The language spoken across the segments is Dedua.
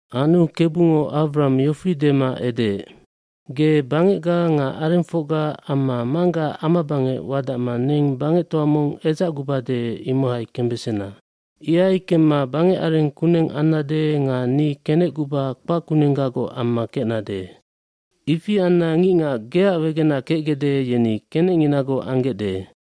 aAnu Kebungo Awram yofi dema edeec, “Ge bangecga nga arengfocga amma manggaac amabangec wadacma neng bangectoa mong edzacgubade imohai kembesena. bIhai kemma bangecareng kuneng ambesannec nga ni kenecguba kpackunenggagoc amma kecnade. Ifi anna ngicngac geac wegenac kecgecde yeni kenecnginagoc anggecde.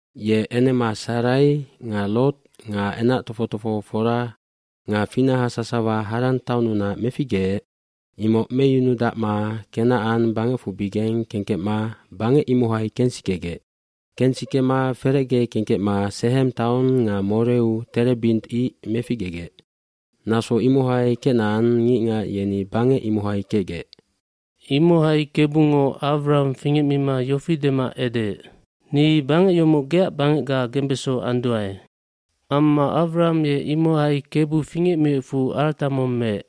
Ye enema Sarai nga Lot nga enac tofoc tofohofora nga finaha sasawa Haran taonnunac meficgeec imoc meyunudacma Kenacan bangecfubigeng kengkecma bangec imohai kensikegec. Kensikema ferecge kengkecma Sehem taong nga Moreud terebint ice meficgegec. Naso imohai Kenacan ngicngac yeni bangec imohai kecgec. fImohai Kebungo Awram fingecmima yofi dema edeec, “Ni bangec yomoc geac bangecga mibeso anduae.” Amma Awram ye imohai Kebu fingecmiecfu yeac arata mong meec.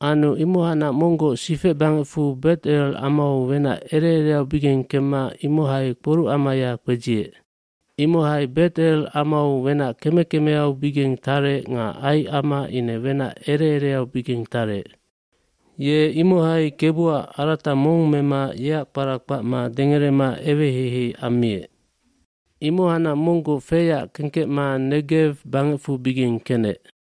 hAnu imohacnac monggoc sifecbangecfu Bet Elgamau wenac ere ereaubigeng kemma imohai kporucamaya kpedziec. Imohai Bet El amau wenac keme kemeaubigeng tarec nga Ai ama ine wenac ere ereaubigeng tarec. Ye imohai Kebuac arata mong mema yeac kpara kpacma dengerema eweheihei ammiec. Imohacnac monggoc feyac kengkecma Negew bangecfubigengi kenec.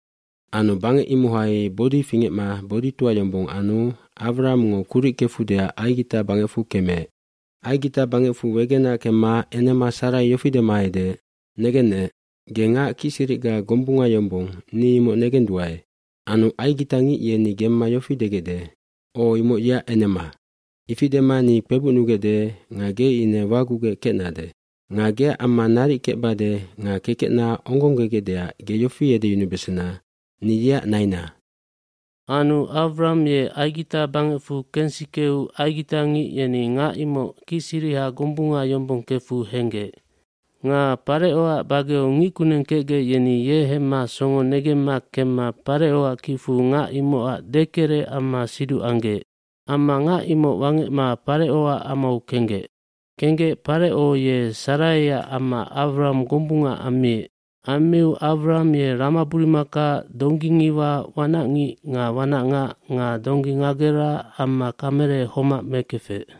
kAnu bangec imohai bodi fingecma boditoa yombong anu Awramngo kuric kefudeac Aigitaj bangecfu kemeec. Aigita bangecfu wegenac kemma enema Sarai yofi dema edeec, “Negennec, ge ngac kicsiricga gombunga yombong ni imoc negenduae. Anu aigitangic yeni gemma yofi degecde, ‘O imoc yeac enema.’ Ifi dema ni kpebucnugecde nga ge ine wagugec kecnade. lNga geac amma naric kecbade nga kekecna ongonggegecdeac ge yofi edeyunubesena, ‘Ni yeac naina.’” Anu Awram ye Aigita bangecfu kensikeu aigitangic yeni ngac imoc kicsiriha gombunga yombong kefu henggec. Nga Parecoac bageu ngickuneng kecgec yeni ye hemma songo negemma kemma Parecoac kicfu ngac imocac dekerec amma siduc anggec. Amma ngac imoc wangecma Parecoac amau kenggec. Kenggec Pareco ye Saraiac amma Awram gombunga ammiec. Ammiu Awram ye ramaburumaka, donggingiwa, wanacngic nga wanacngac nga donggi ngagera amma kamele homac mekefec.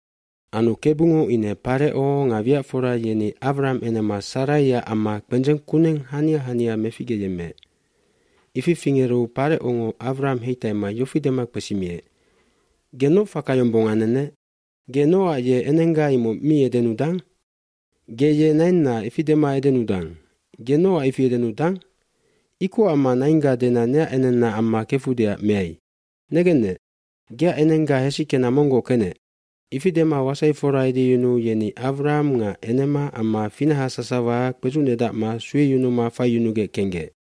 mAnu Kebungo ine Pareco nga wiacfora yeni Awram enema Saraiac amma kpendzeng kuneng hania hania meficgeyemmeec. Ifi fingeru Parecongo Awram heitaima yofi dema kpesimiec, “Ge noc faka yombong anennec? Ge nocac ye enengga imoc miedenudang? Ge ye nainna, ifi dema edenudang. Ge nocac ifiedenudang? Ikoc amma naingga dena neac enenna amma kefudeacmeai? Negennec, geac enengga hesickena monggoc kenec.” Ifidema wasaifora edeyunuu yeni Awram nga enema amma finahasasawa kpedzucnedacma sueyunuma faiyunugec kenggec.